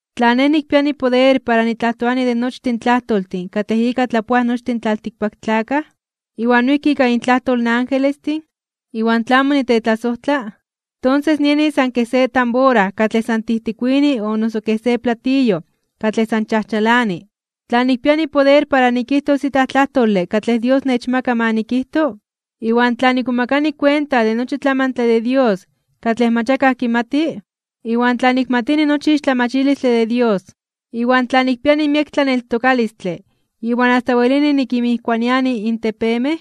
Tla nej nikpiani poder para nitlajtoani de nochtin tlajtoltin katlej ika tlapoaj nochtin in tlaltikpaktlakaj, iwan noijki ika intlajtol in angelestin, iwan tla amo nitetlasojtla, tonses nieni san kej se tambora katlej san tijtikuini o noso kej se platillo katlej san chajchalani. Tla nikpiani poder para nikijtos itlaj tlajtole katlej Dios nechmaka ma nikijto, iwan tla nikmomakani kuenta de nochi tlamantle de Dios katlej mach akaj kimati, iwan tla nikmatini nochi ixtlamachilistle de Dios, iwan tla nikpiani miek tlaneltokalistle iwan asta welini nikinmijkuaniani in tepemej,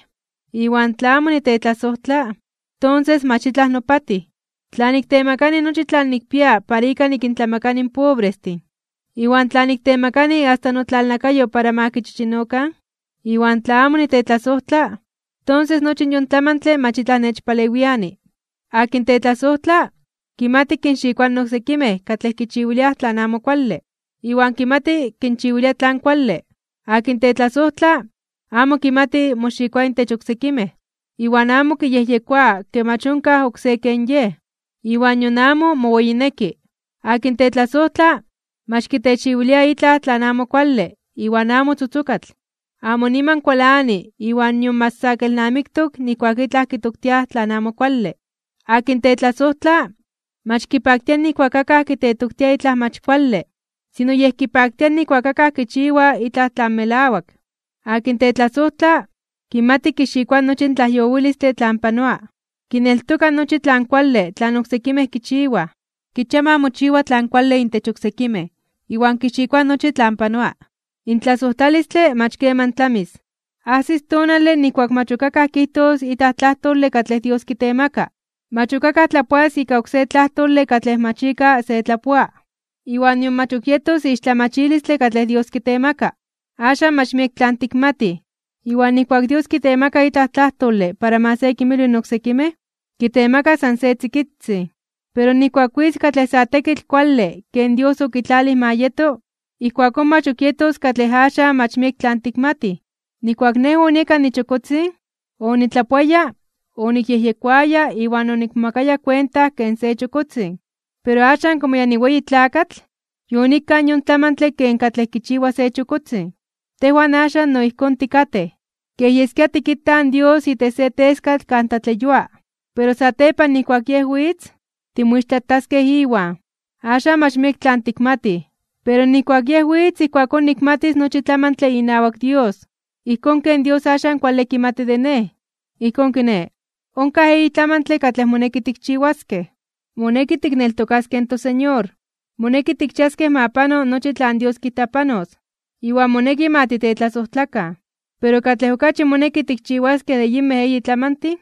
iwan tla amo nitetlasojtla, tonses mach itlaj nopatij. Tla niktemakani nochi tlan nikpia para ika nikintlamakani in pobrestin, iwan tla niktemakani asta notlalnakayo para ma kichichinokan, iwan tla amo nitetlasojtla, tonses nochi yon tlamantle mach itlaj nechpalewiani. Akin tetlasojtla, kimati kinxikoa in oksekimej katlej kichiwiliaj tlan amo kuale, iwan kimati kinchiwilia tlan kuale. Akin tetlasojtla, amo kimati moxikoa intech oksekimej, iwan amo kiyejyekoa ke mach onkaj oksé ken yej, iwan nion amo moweyineki. Akin tetlasojtla, mach kitechiwilia itlaj tlan amo kuale iwan amo tzotzokatl. Amo niman kualani iwan nion mach sa kelnamiktok nijkuak itlaj kitoktiaj tlan amo kuale. Akin tetlasojtla, mach kipaktia nijkuak akaj kitetoktia itlaj mach kuale, sino yej kipaktia nijkuak akaj kichiwaj itlaj tlan melawak. Akin tetlasojtla, kimati kixikoa nochi in tlajyowilistle tlan panoa, kineltoka nochi tlan kuale tlan oksekimej kichiwaj, kichia ma mochiwa tlan kuale intech oksekimej, iwan kixikoa nochi tlan panoa. In tlasojtlalistle mach keman tlamis. Ajsis tonale nijkuak mach ok akaj kijtos itlaj tlajtole katlej Dios kitemaka, mach ok akaj tlapoas ika oksé tlajtole katlej mach ika se tlapoa, iwan nion mach ok yetos ixtlamachilistle katlej Dios kitemaka. Axan mach miek tlan tikmatij, iwan nijkuak Dios kitemaka itlaj tlajtole para ma se kinmilwi in oksekimej, kitemaka san se tzikitzin. Pero nijkuak witz katlej sa tekitl kuale ken Dios okitlalij ma yeto, ijkuakón mach ok yetos katlej axan mach miek tlan tikmatij. Nijkuak nej onieka nichokotzin, onitlapoaya, onikyejyekoaya iwan onikmomakaya kuenta ken se chokotzin. Pero axan komo ya niweyi tlakatl, yonikkaj yon tlamantle ken katlej kichiwa se chokotzin. Tejwan axan no ijkón tikatej, kej yeskia tikitaj in Dios itech se teskatl kan tlatleyua. Pero satepan nijkuak Yej witz, timoixtlataskej Iwan. Axan mach miek tlan tikmatij, pero nijkuak Yej witz ijkuakón nikmatis nochi tlamantle inawak Dios, ijkón ken Dios axan kuale kimati de nej. Ijkón kiné, onkaj eyi tlamantle katlej moneki tikchiwaskej. Moneki tikneltokaskej in toSeñor, moneki tikchiaskej ma pano nochi tlan Dios kijta panos, iwan moneki ma titetlasojtlakan. Pero katlej okachi moneki tikchiwaskej de yinmej eyin tlamantin,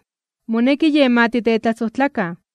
moneki yen ma titetlasojtlakan.